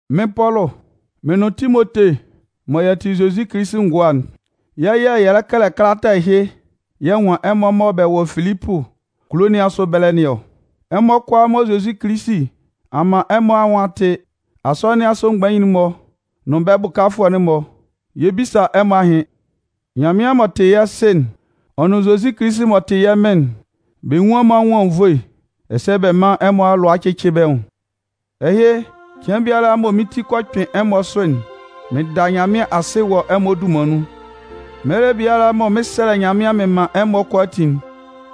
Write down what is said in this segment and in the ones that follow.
Mɩ́n Pɔlʋ, mɩn nʋn Timote mɔ yɛ tɩ Zozi Kilisi ngʋa'n, yɛ́ yɛ̂ yɛ lɛ kɛlɛ kalata ɛhɩ yɛ nwan ɛmɔ mɔ bɛ wɔ Filipʋ kulo nɩn asʋ ɛbɛlɛ nɩn ɔ. Ɛmɔ kʋalaa mɔ Zozi Kilisi a man ɛmɔ anwʋn a tɩ'n, Asɔnɩn nɩn asʋ mgbain'n-mɔ nʋn bɛ́ bʋkafʋɛ'n-mɔ, yɛ 'bisa ɛmɔ ahɩn. Nyanmɩan m'ɔ tɩ yɛ́ Sɩ'n, ɔ nʋn Zozi Kilisi m'ɔ tɩ yɛ́ Mɩn'n, bɛ nwún ɛmɔ anwʋn anwunnvoe ɛsɛ bɛ mán ɛmɔ alʋa cɩ́cɩ bɛ́ nwʋn. Ɛhɩ, cɩan biala mɔ mɩn ti kɔ kpɩn ɛmɔ asʋ'n, mɩn da Nyanmɩan asɩ wɔ ɛmɔ dunman nun. Mɛlɛ biala mɔ mɩn 'sɛlɛ Nyanmɩan mɩn man ɛmɔ kʋalaatin'n,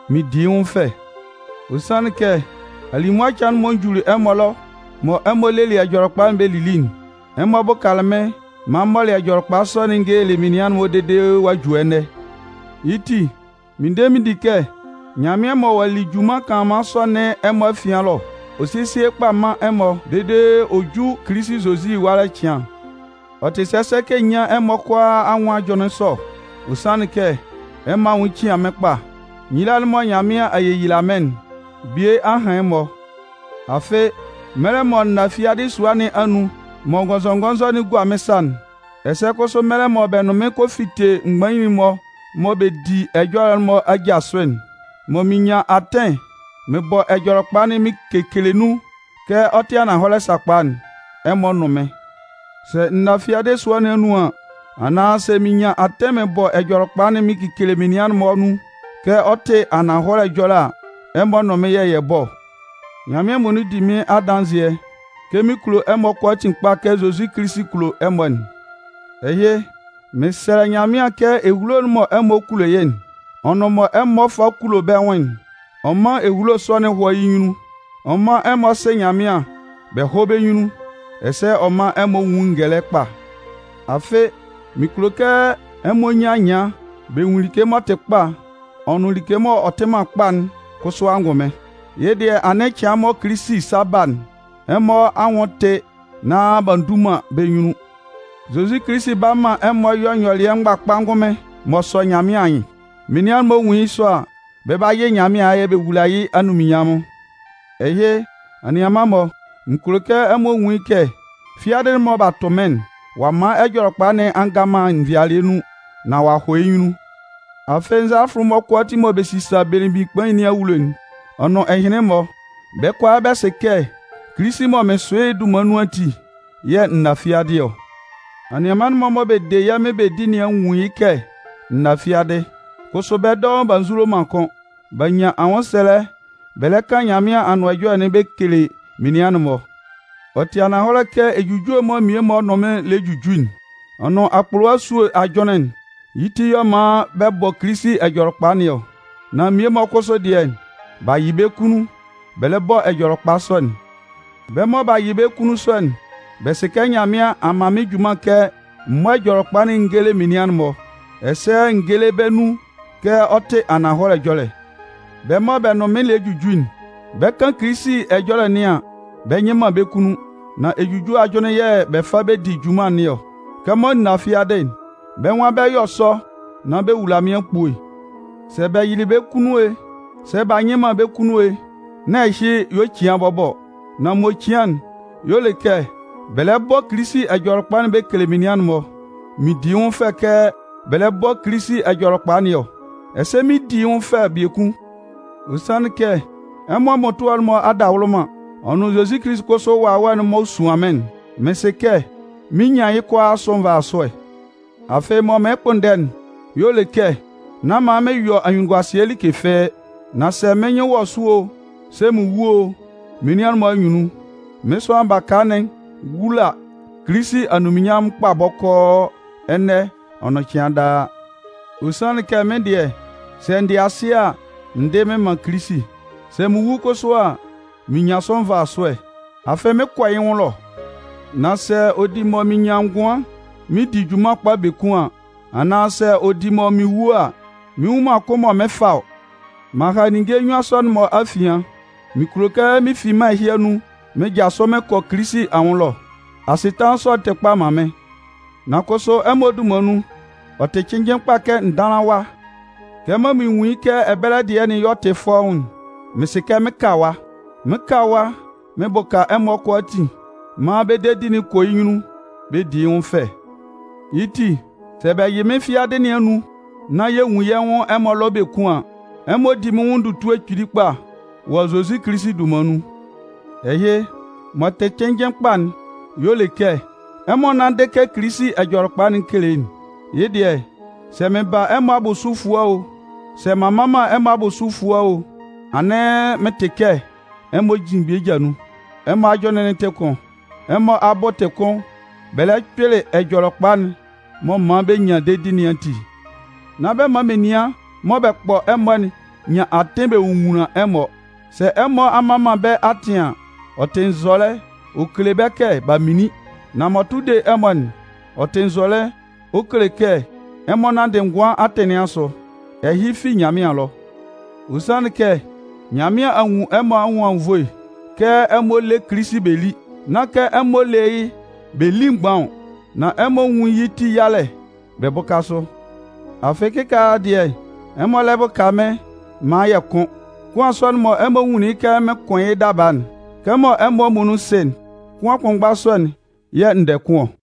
mɩn di yɩ́ nwʋn fɛ. Ɔ sanlɩn kɛ, alimʋa cɩan'n mɔ n juli ɛmɔ ɛlɔ mɔ ɛmɔ lelɩ Ɛjɔlɛkpa'n bɛ lili'n, ɛmɔ bʋkalɩ mɩ́n maan m mɔlɩ Ɛjɔlɛkpa sɔ'n n gelelɩ menian'n-mɔ dede ɔ'a ju ɛnɛ. Yɩ́ ti, mɩn de mɩn di kɛ Nyanmɩan mɔ ɔ'a li junman kanlanman sɔ nɩn ɛmɔ afian ɛlɔ'n, ɔ 'sesie yɩ́ kpa man ɛmɔ dede ɔ ju Kilisi Zozi ɛwalɛ cɩan. Ɔ tɩ sɛsɛ kɛ n nyán ɛmɔ kʋalaa anwʋn ajʋnlɩn sɔ, ɔ sanlɩn kɛ ɛmɔ anwʋn cian mɩ́n kpa. Nyila'n mɔ Nyanmɩan a yeyila mɩ́n'n, bie a han ɛmɔ. Afɩ, mɛlɛ mɔ n na fiadɩ sua nɩn anun mɔ ngɔnzɔngɔnzɔ'n gua mɩ́n sa'n, ɛsɛ kʋsʋ, mɛlɛ mɔ bɛ nʋn mɩ́n kɔ fite mgbain'n-mɔ mɔ bɛ di ɛjɔlɛ'n-mɔ aja sʋ'n, mɔ mɩn nyan atɩn mɩn bɔ Ɛjɔlɛkpa'n mɩn kekele nun kɛ ɔ tɩ ananhɔlɛ sakpa'n, ɛmɔ nʋn mɩ́n. Sɛ n na fiadɩ sua nɩn anun an, anaan sɛ mɩn nyan atɩn mɩn bɔ Ɛjɔlɛkpa'n mɩn kekele menian'n-mɔ nun kɛ ɔ tɩ ananhɔlɛ ɛjɔlɛ a, ɛmɔ nʋn mɩ́n yɛ̂ yɛ bɔ ɔ. Nyanmɩan muonun di mɩ́n adanzɩɛ kɛ mɩn kulo ɛmɔ kʋalaatin kpa kɛ Zozi Kilisi kulo ɛmɔ'n. Ɛhɩ, mɩn sɛlɛ Nyanmɩan kɛ ehulo'n mɔ ɛmɔ kulo yɩ́'n, ɔ nʋn mɔ ɛmɔ fa kulo bɛ́ nwʋn'n, ɔ mán ehulo sɔ'n hɔ́ yɩ́ nyunnun. Ɔ mán ɛmɔ sɩ́ Nyanmɩan bɛ hɔ́ bɛ́ nyunnun, ɛsɛ ɔ mán ɛmɔ nwún ngɛlɛ kpa. Afɩ, mɩn kulo kɛ ɛmɔ nyan anyɩan bɛ nwun like m'ɔ tɩ kpa ɔ nʋn like m'ɔ tɩ man kpa'n kʋsʋ angʋnmɩn. Yɩ́ dɩɛ, anɩn cɩan mɔ Kilisi 'sa ba'n, ɛmɔ anwʋn tɩ nán b'a ndu man bɛ́ nyunnun. Zozi Kilisi 'ba man ɛmɔ yɔ nyɔlɩɛ mgbakpa ngʋnmɩn m'ɔ sɔ Nyanmɩan anyɩn. Menian'n-mɔ nwun yɩ́ sɔ a, bɛ 'ba yɩ Nyanmɩan ayɛ bɛ wula yɩ́ anunminnyanmʋn. Ɛhɩ, anianman-mɔ, mɩn kulo kɛ ɛmɔ nwun yɩ́ kɛ fiadɩ'n mɔ b'a tʋ mɩ́n'n, ɔ'a man Ɛjɔlɛkpa nɩn a nga man nvɩalɩɛ nun nán ɔ'a hɔ yɩ́ nyunnun. Afɩ, nzalafʋ'n-mɔ kʋalaatin mɔ bɛ sisa belemgbin kpain nɩn awulo'n, ɔ nʋn ɛhɩnlɩn-mɔ, bɛ́ kʋalaa bɛ sɩ kɛ Kilisi mɔ mɩn sʋ yɩ́'n dunman nun ati yɛ̂ n na fiadɩ ɔ. Anianman'n-mɔ mɔ bɛ de yɛ́ Mɩn bɛ di nɩn a nwun yɩ́ kɛ n na fiadɩ, kʋsʋ bɛ́ dɔʋn b'a nzulo man kʋ́n. B'a nyan anwʋnsɛlɛ bɛ lɛ kan Nyanmɩan Anʋan Ɛjɔlɛ'n bɛ kele menian'n-mɔ. Ɔ tɩ ananhɔlɛ kɛ ejujue'n mɔ mmie-mɔ nʋn mɩn lɛ juju'n, ɔ nʋn akpʋlʋwa esue ajʋnlɩn'n, yɩ́ ti y'ɔ man bɛ bɔ Kilisi Ɛjɔlɛkpa nɩn ɔ. Nan mmie-mɔ kʋsʋ dɩɛ, b'a yɩ bɛ́ kunnun bɛ lɛ bɔ Ɛjɔlɛkpa sɔ'n. Bɛ́ mɔ b'a yɩ bɛ́ kunnun sɔ'n, bɛ sɩ kɛ Nyanmɩan a man mɩ́n junman kɛ m mɔ́ Ɛjɔlɛkpa'n n géle menian'n-mɔ, ɛsɛ n géle bɛ́ nun kɛ ɔ tɩ ananhɔlɛ ɛjɔlɛ. Bɛ́ mɔ bɛ nʋn mɩn lɛ juju'n, bɛ 'kan Kilisi ɛjɔlɛ nɩan an, bɛ nyɩ man bɛ́ kunnun. Nan ejujue ajʋnlɩn yɛ̂ bɛ fa bɛ di junman nɩn ɔ. Kɛmɔ n na fiadɩ'n, bɛ́ nwan bɛ 'yɔ sɔ nan bɛ wula mɩ́n akpue. Sɛ bɛ yɩlɩ bɛ́ kunnun e, sɛ b'a nyɩ man bɛ́ kunnun e, nán ɛhɩ y'ɔ cian bɔbɔ ɔ. Nan m'ɔ cian'n y'ɔ le kɛ bɛ lɛ bɔ Kilisi Ɛjɔlɛkpa'n bɛ kele menian'n-mɔ. Mɩn di yɩ́ nwʋn fɛ kɛ bɛ lɛ bɔ Kilisi Ɛjɔlɛkpa nɩn ɔ. Ɛsɛ mɩn 'di yɩ́ nwʋn fɛ biekun. Ɔ sanlɩn kɛ ɛmɔ mmʋtʋɛ'n-mɔ adawʋlʋman, ɔ nʋn Zozi Kilisi kʋsʋ Wawɛ'n m'ɔ suan mɩ́n'n, mɩn sɩ kɛ mɩn 'nyan yɩ́ kʋalaa asʋ nvasʋɛ. Afɩ, mɔ mɩɩn kpʋnndɛ'n y'ɔ le kɛ nán man mɩn yɔ anyunnunguasɩɛ like fɩ́ɩ́. Nan sɛ mɩ́n nyɩn wɔ sʋ o, sɛ mɩn wu o, menian'n-mɔ anyunnun, mɩ́n sʋanlan baka'n 'wula Kilisi anunminnyanmʋn kpa bɔkɔɔ ɛnɛ ɔ nʋn cɩan daa. Ɔ sanlɩn kɛ mɩ́n dɩɛ, sɛ n dɩ asɩ a, n dɩ mɩn man Kilisi. Sɛ mɩn wu kʋsʋ a, mɩn nyan sʋ nvasʋɛ, afɩ mɩn 'kɔ yɩ́ nwʋn ɛlɔ. Nan sɛ ɔ di mɔ mɩn nyan ngʋan mɩn di junman kpa biekun an, anaan sɛ ɔ di mɔ mɩn wu a, mɩn nnwun man kʋn mɔ mɩn 'fa ɔ. M'an ha ninnge nnyuan sɔ'n-mɔ afian. Mɩn kulo kɛ mɩn fi mân ɛhɩ anun mɩn jasʋ mɩn kɔ Kilisi anwʋn ɛlɔ. Asɩtanlan sɔ'n tɩ kpa man mɩ́n. Nan kʋsʋ ɛmɔ dunman nun, ɔ tɩ cɩnnjɩn kpa kɛ n dánlan ɛwa. Kɛmɔ mɩn nwun yɩ́ kɛ ɛbɛlɛ dɩɛ'n y'ɔ tɩ fɔ́ʋ́n'n, mɩn sɩ kɛ mɩn 'ka ɛwa. Mɩn 'ka ɛwa mɩn bʋka ɛmɔ kʋalaatin maan bɛ́ dedi'n kɔ yɩ́ nyunnun bɛ di yɩ́ nwʋn fɛ. Yɩ́ ti, sɛ bɛ yɩ mɩ́n fi fiadɩ nɩn anun nán yɛ nwun yɛ́ nwʋn ɛmɔ ɛlɔ biekun an, ɛmɔ 'di mɩ́n nwʋn ndutue kpili kpa wɔ Zozi Kilisi dunman nun. Ɛhɩ, mɔ tɩ cɩnnjɩn kpa'n y'ɔ le kɛ, ɛmɔ nánndɩ kɛ Kilisi Ɛjɔlɛkpa'n kele'n. Yɩ́ dɩɛ, sɛ mɩn ba ɛmɔ abʋsʋ efua o, sɛ m'an mma man ɛmɔ abʋsʋ efua o, anɩn mɩn tɩ kɛ ɛmɔ jin bɛ́ ja nun, ɛmɔ ajʋnlɩn'n tɩ kʋn, ɛmɔ abʋ tɩ kʋn bɛ lɛ kpɩlɩ Ɛjɔlɛkpa'n m'ɔ man bɛ nyan dedi nɩn ati. Nán bɛ man menian mɔ bɛ kpɔ ɛmɔ'n nyan atɩn bɛ nwonwunlan ɛmɔ. Sɛ ɛmɔ a mman man bɛ́ atɩn an, ɔ tɩ nzɔlɛ ɔ kele bɛ́ kɛ b'a minlin. Nan m'ɔ tʋ de ɛmɔ'n, ɔ tɩ nzɔlɛ ɔ kele kɛ ɛmɔ nanndɩ ngʋan atɩn nɩn asʋ. Ɛhɩ fi Nyanmɩan ɛlɔ. Ɔ sanlɩn kɛ Nyanmɩan a nwun ɛmɔ anwʋn anwunnvoe kɛ ɛmɔ lé Kilisi bɛ lí. Nán kɛ ɛmɔ lé yɩ́ bɛ lí mgban ɔ, nan ɛmɔ nwún yɩ́ ti yalɛ bɛ bʋ́ka sʋ. Afɩ kɩkaala dɩɛ, ɛmɔ lɛ bʋka mɩ́n maan yɛ kʋn. Kʋan sɔ'n mɔ ɛmɔ nwunlin kɛ mɩɩn kʋn yɩ́ daba'n, kɛmɔ ɛmɔ muonun sɩ'n, kʋan kʋnmgba sɔ'n yɛ̂ n dɛ kʋn ɔ.